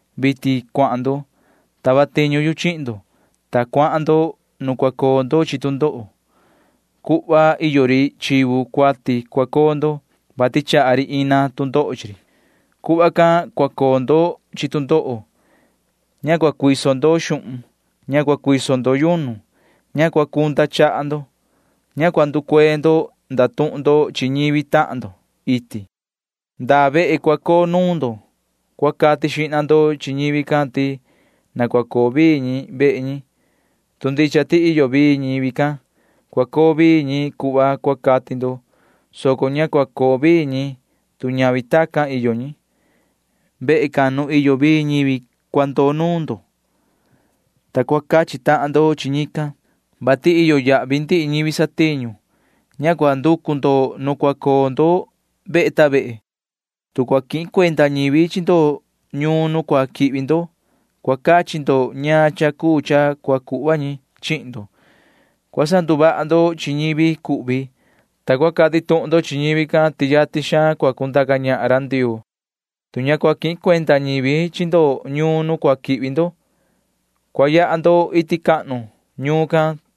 Vitin cuahan ndo. Tava tiñu yu chihin ndo, ta cuahan ndo nu cua coo ndo chi tu ndoho. Cuhva iyo ri chivu cuati cua coo ndo, vati chaha ri ina tu ndoho chi ri. [Cuhva can cua coo ndo chi tu ndoho.] Ña cua cuiso ndo xuhun. Ña cua cuiso ndo yunu. Ña cua cunda chaha ndo. Ña cua nducuee ndo ndatuhun ndo chi ñivi tahan ndo iti. Ndaa vehe cua coo nuun ndo cua cati xihna ndo chi ñivi can ti na cua coo vii ñi vehe ñi. Tu ndicha ti iyo vii ñivi can, cua coo vii ñi cuhva cua cati ndo, soco ña cua coo vii ñi, tu ñavi tacan iyo ñi. Vehe can nu iyo vii ñivi cua ndoo nuun ndo, ta cua cachi tahan ndo chi ñican, vati iyo yahvi ndihi ñivi satiñu. Ña cua nducu ndo nu cua coo ndo vehe ta vehe. Tu cua quihin cuenda ñivi chi ndo ñuun nu cua quihvi ndo, cua cachi ndo ñaan cha cuu cha cua cuhva ñi chihin ndo. Cua sanduvaha ndo chi ñivi cuhvi, ta cua cati tuhun ndo chi ñivi can ti yatin xaan cua cundaca ñahan ra Ndioo. Tu ña cua quihin cuenda ñivi chi ndo ñuun nu cua quihvi ndo, cua yaha ndo iti cahnu ñuun can,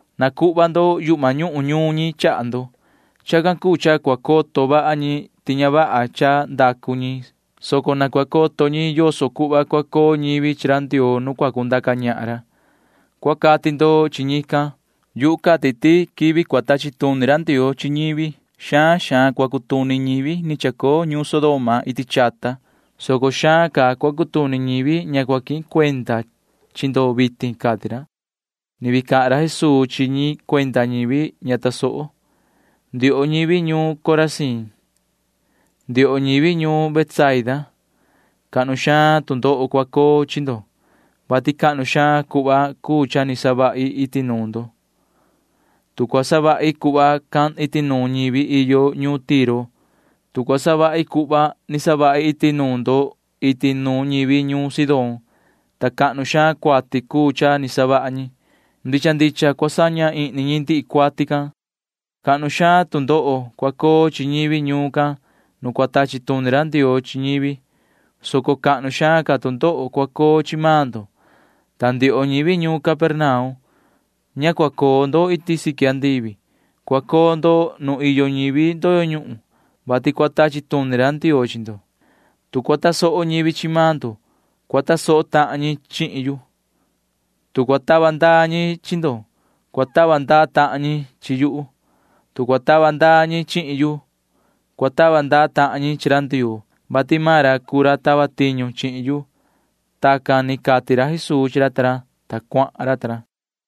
nacuhva ndo yuhma ñuhun ñuun ñi chaha ndo. Chacan cuu cha cua coto vaha ñi ti ña vaha cha ndacu ñi, soco na cua coto ñi yoso cuhva cua coo ñivi chi ra Ndioo nu cua cundaca ñahan ra, cua cati ndo chi ñican. Yuhu cati ti quivi cua tachi tuni ra Ndioo chi ñivi xaan xaan cua cutuni ñivi ni chacoo ñuun Sodoma iti chata, soco xaan ca cua cutuni ñivi ña cua quihin cuenda chi ndo vitin ―cati ra. [Ni vii cahan ra Jesuu chi ñi cuenda ñivi ña tasoho:] ’Ndioho ñivi ñuun Corazín, ndioho ñivi ñuun Betsaida, cahnu xaan tu ndoho cua coo chi ndo, vati cahnu xaan cuhva cuu cha ni savahi iti nuun ndo. Tu cua savahi cuhva can iti nuun ñivi iyo ñuun Tiro, tu cua savahi cuhva ni savahi iti nuun ndo iti nuun ñivi ñuun Sidón, ta cahnu xaan cuati cuu cha ni savaha ñi, ndicha ndicha cua saña ihni ñi ndihi cuati can. Cahnu xaan tu ndoho cua coo chi ñivi ñuun can nu cua tachi tuni ra Ndioo chi ñivi, soco cahnu xaan ca tu ndoho cua coo chi maan ndo. Ta ndioho ñivi ñuun Capernaum, ña cua coo ndo iti siqui andivi. Cua coo ndo nu iyo ñivi ndoyo ñuhun, [vati cua tachi tuni ra Ndioo chi ndo]. ’Tu cua tasoho ñivi chi maan ndo, cua tasoho tahan ñi chihin yu. Tu cua tava ndaa ñi chi ndo, cua tava ndaa tahan ñi chi yuhu. Tu cua tava ndaa ñi chihin yu, cua tava ndaa tahan ñi chi ra Ndioo, vati maan ra cuu ra tava tiñu chihin yu. Tacan ni cati ra Jesuu chi ra ta ra, ta cuahan ra ta ra.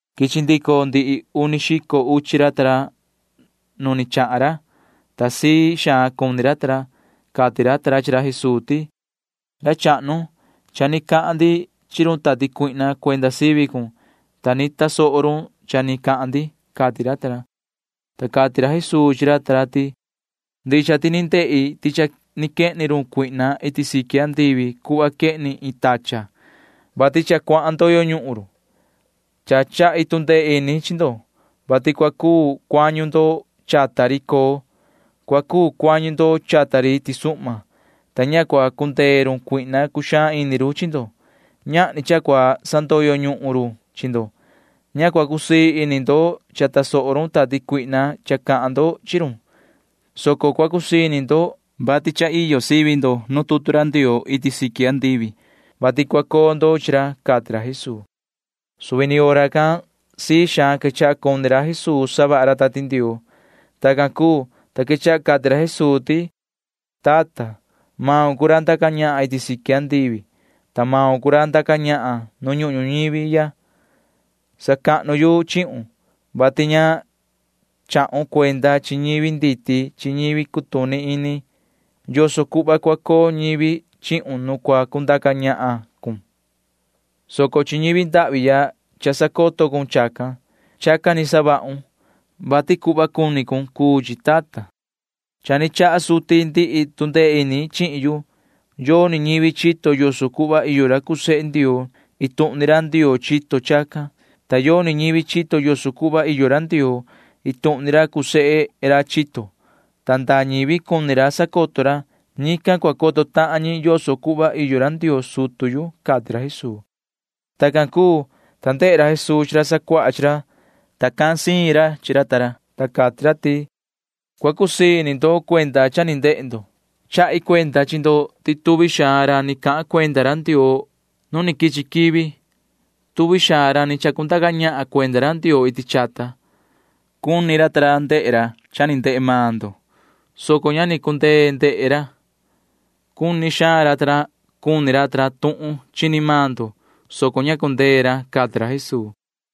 Quichi ndico ndihi uni xico uchi ra ta ra nu ni chahan ra, ta sii xaan cuni ra ta ra. Cati ra ta ra chi ra Jesuu ti: ―Ra chahnu, cha ni cahan ndi chi run tati cuihna cuenda sivi cun, ta ni tasoho run cha ni cahan ndi ―cati ra ta ra. Ta cati ra Jesuu chi ra ta ra ti: ―Ndicha ti ni ndehi ti cha ni quehni run Satanaa iti siqui andivi cuhva quehni iin tachan, [vati cha cuahan ndoyo ñuhun run]. Cha chahi tu ndee ini chi ndo, vati cua cuu cuañu ndo chata ri coo, cua cuu cuañu ndo chata ri tisuhma, ta ña cua cundee run Satanaa cuxaan ini run chi ndo. Ñahni cha cua cuu sandoyo ñuhun run chi ndo. Ña cua cusii ini ndo cha tasoho run tati cuihna cha cahan ndo chi run, soco cua cusii ini ndo, vati cha iyo sivi ndo nu tutu ra Ndioo iti siqui andivi, [vati cua coo ndo chi ra] ―cati ra Jesuu. Suvi ni hora can sii xaan quechaha cuni ra Jesuu savaha ra Tati Ndioo. Tacan cuu, ta quechaha cati ra Jesuu ti: ―Yoho tata, maun cuu ra ndaca ñahan iti siqui andivi, ta maun cuu ra ndaca ñahan nu ñuhun ñuñivi ya. Sacahnu yu chihun, vati ña chahun cuenda chi ñivi nditi chi ñivi cutuni ini yoso cuhva cua coo ñivi chihun nu cua cundaca ñahan cun, soco chi ñivi ndahvi ya cha sacoto cun chacan. Chacan ni savahun, vati cuhva cuni cun cuu chi, tata. ’Cha ni chaha suti ndihi tu ndee ini chihin yu. Yoni ñivi chito yoso cuhva iyo ra cuu sehe Ndioo. Iin tuhun ni ra Ndioo chito chacan, ta yoni ñivi chito yoso cuhva iyo ra Ndioo. Iin tuhun ni ra cuu sehe ra chito, ta ndaa ñivi cuni ra sacoto ra―ñican cua coto tahan ñi yoso cuhva iyo ra Ndioo sutu yu ―cati ra Jesuu. Tacan cuu, ta ndehe ra Jesuu chi ra sacuaha chi ra, ta cahan siin ra chi ra ta ra, ta cati ra ti: ―Cua cusii ini ndo cuenda cha ni ndehe ndo. Chahi cuenda chi ndo ti tuvi xaan ra ni cahan cuenda ra Ndioo nu quichi quivi, tuvi xaan ra ni chacundaca ñahan cuenda ra Ndioo iti chata―cuni ra ndehe ra cha ni ndehe maan ndo, soco ña ni cundee ndehe ra. Cuni xaan ra ta ra cuni ra tuhun chini maan ndo, soco ña cundee ra ―cati ra Jesuu.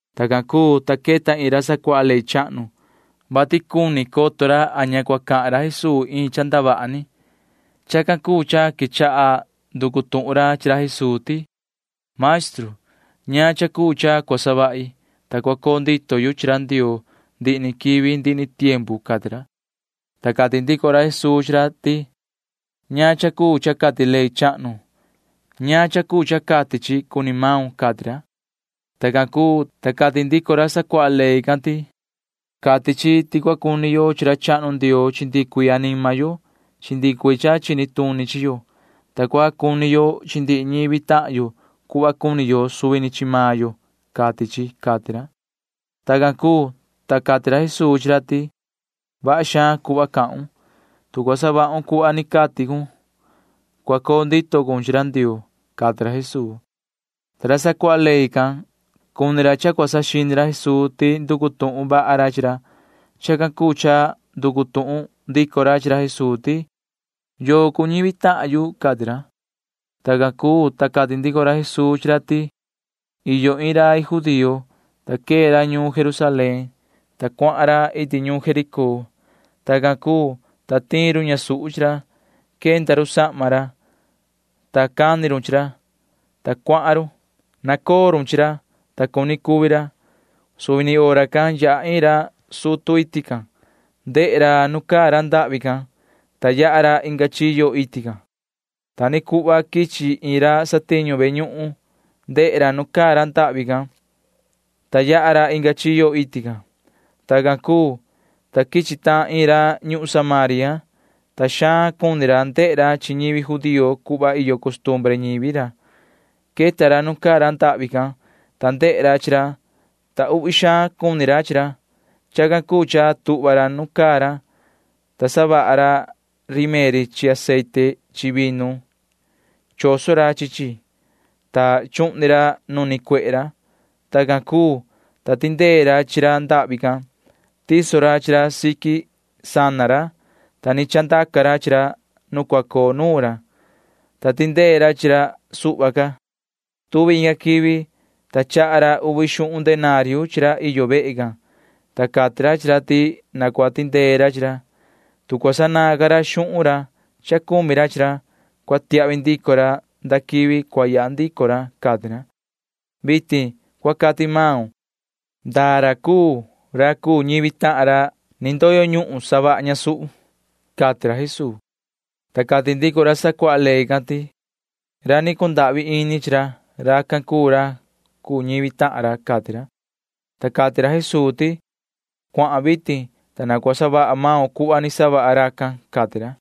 Tacan cuu, ta queta iin ra sacuaha ley chahnu, vati cuni coto ra a ña cua cahan ra Jesuu iin cha ndavaha ni. Chacan cuu cha quechaha nducu tuhun ra chi ra Jesuu ti: ―Maestru, ¿ñaan cha cuu cha cua savahi, ta cua coo ndito yu chi ra Ndioo ndihi ni quivi ndihi ni tiempu? ―cati ra. Ta cati ndico ra Jesuu chi ra ti: ―¿Ñaan cha cuu cha cati ley chahnu? ¿Ñaan cha cuu cha cati chi cuni maun? ―cati ra. Tacan cuu, ta cati ndico ra sacuaha ley can ti: ―Cati chi ti cua cuni yo chi ra chahnu Ndioo chi ndihi cuii anima yo chi ndihi cuii cha chini tuni chi yo, ta cua cuni yo chi ndihi ñivi tahan yo cuhva cuni yo suvi ni chi maan yo, cati chi ―cati ra. Tacan cuu, ta cati ra Jesuu chi ra ti: ―Vaha xaan cuhva cahun. Tu cua savahun cuhva ni cati cun, cua coo ndito cun chi ra Ndioo ―cati ra Jesuu. Ta ra sacuaha ley can―cuni ra cha cua saxini ra Jesuu ti nducu tuhun vaha ra chi ra. Chacan cuu cha nducu tuhun ndico ra chi ra Jesuu ti: ―¿Yoo cuu ñivi tahan yu? ―cati ra. Tacan cuu, ta cati ndico ra Jesuu chi ra ti: ―Iyo iin rai judío, ta quee ra ñuun Jerusalén, ta cuahan ra iti ñuun Jericó. Tacan cuu, ta tiin run ñasuhu chi ra. Quenda run sahma ra, ta cani run chi ra, ta cuahan run. Nacoo run chi ra, ta cuni cuvi ra. Suvi ni hora can yaha iin ra sutu iti can. Ndehe ra nu caa ra ndahvi can, ta yaha ra inga chiyo iti can. Ta ni cuhva quichi iin ra satiñu ve ñuhun. Ndehe ra nu caa ra ndahvi can, ta yaha ra inga chiyo iti can. Tacan cuu, ta quichi tahan iin ra ñuhun Samaria, [ta xaan cuni ra ndehe ra chi ñivi judío cuhva iyo costumbre ñivi ra]. Queta ra nu caa ra ndahvi can, ta ndehe ra chi ra, ta uhvi xaan cuni ra chi ra. Chacan cuu cha tuhva ra nu caa ra, ta savaha ra rimeri chi aceite chi vinu. Choso ra chi chi, ta chuhni ra nu nicuehe ra. Tacan cuu, ta tindee ra chi ra ndahvi can. Tiso ra chi ra siqui sana ra, ta ni chandaca ra chi ra nu cua coo nuun ra, ta tindee ra chi ra suhva ca. Tuvi inga quivi, ta chaha ra uvi xuhun denario chi ra iyo vehe can, ta cati ra chi ra ti na cua tindee ra chi ra. Tu cua sanaan ca ra xuhun ra cha cumi ra chi ra, cua tiahvi ndico ra nda quivi cua yaha ndico ra, cati ra. Vitin cua cati maun. ¿Ndaa ra cuu ra cuu ñivi tahan ra ni ndoyo ñuhun savaha ñasuhu? ―cati ra Jesuu chi ra. Ta cati ndico ra sacuaha ley can ti: ―Ra ni cundahvi ini chi ra―racan cuu ra cuu ñivi tahan ra ―cati ra. Ta cati ra Jesuu ti: ―Cuahan vitin, ta na cua savaha maun cuhva ni savaha racan ―cati ra.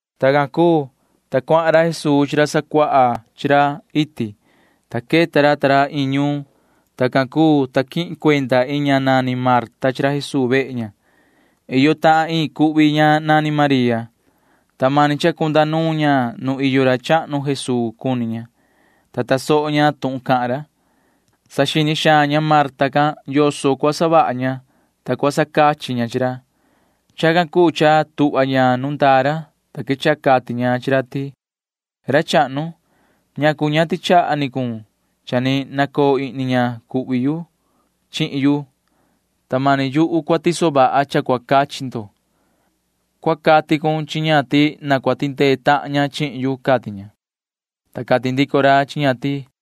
Tacan cuu, ta cuahan ra Jesuu chi ra sacuaha chi ra iti, ta queta ra ta ra iin ñuun. Tacan cuu, ta quihin cuenda iin ña nani Marta chi ra Jesuu vehe ña. Iyo tahan iin cuhvi ña nani María, ta mani cha cunda nuun ña nu iyo ra chahnu Jesuu cuni ña, ta tasoho ña tuhun cahan ra. Saxini xaan ña Marta can yoso cua savaha ña, ta cua sacachi ña chi ra. Chacan cuu cha tuhva ña nu ndaa ra, ta quechaha cati ña chi ra ti: ―Ra chahnu, ¿ñacu ña tichaha ni cun cha ni nacoo ihni ña cuhvi yu chihin yu, ta mani yu cua tiso vaha cha cua cachi ndo? Cua cati cun chi ña ti na cua tindee tahan ña chihin yu ―cati ña. Ta cati ndico ra chi ña ti: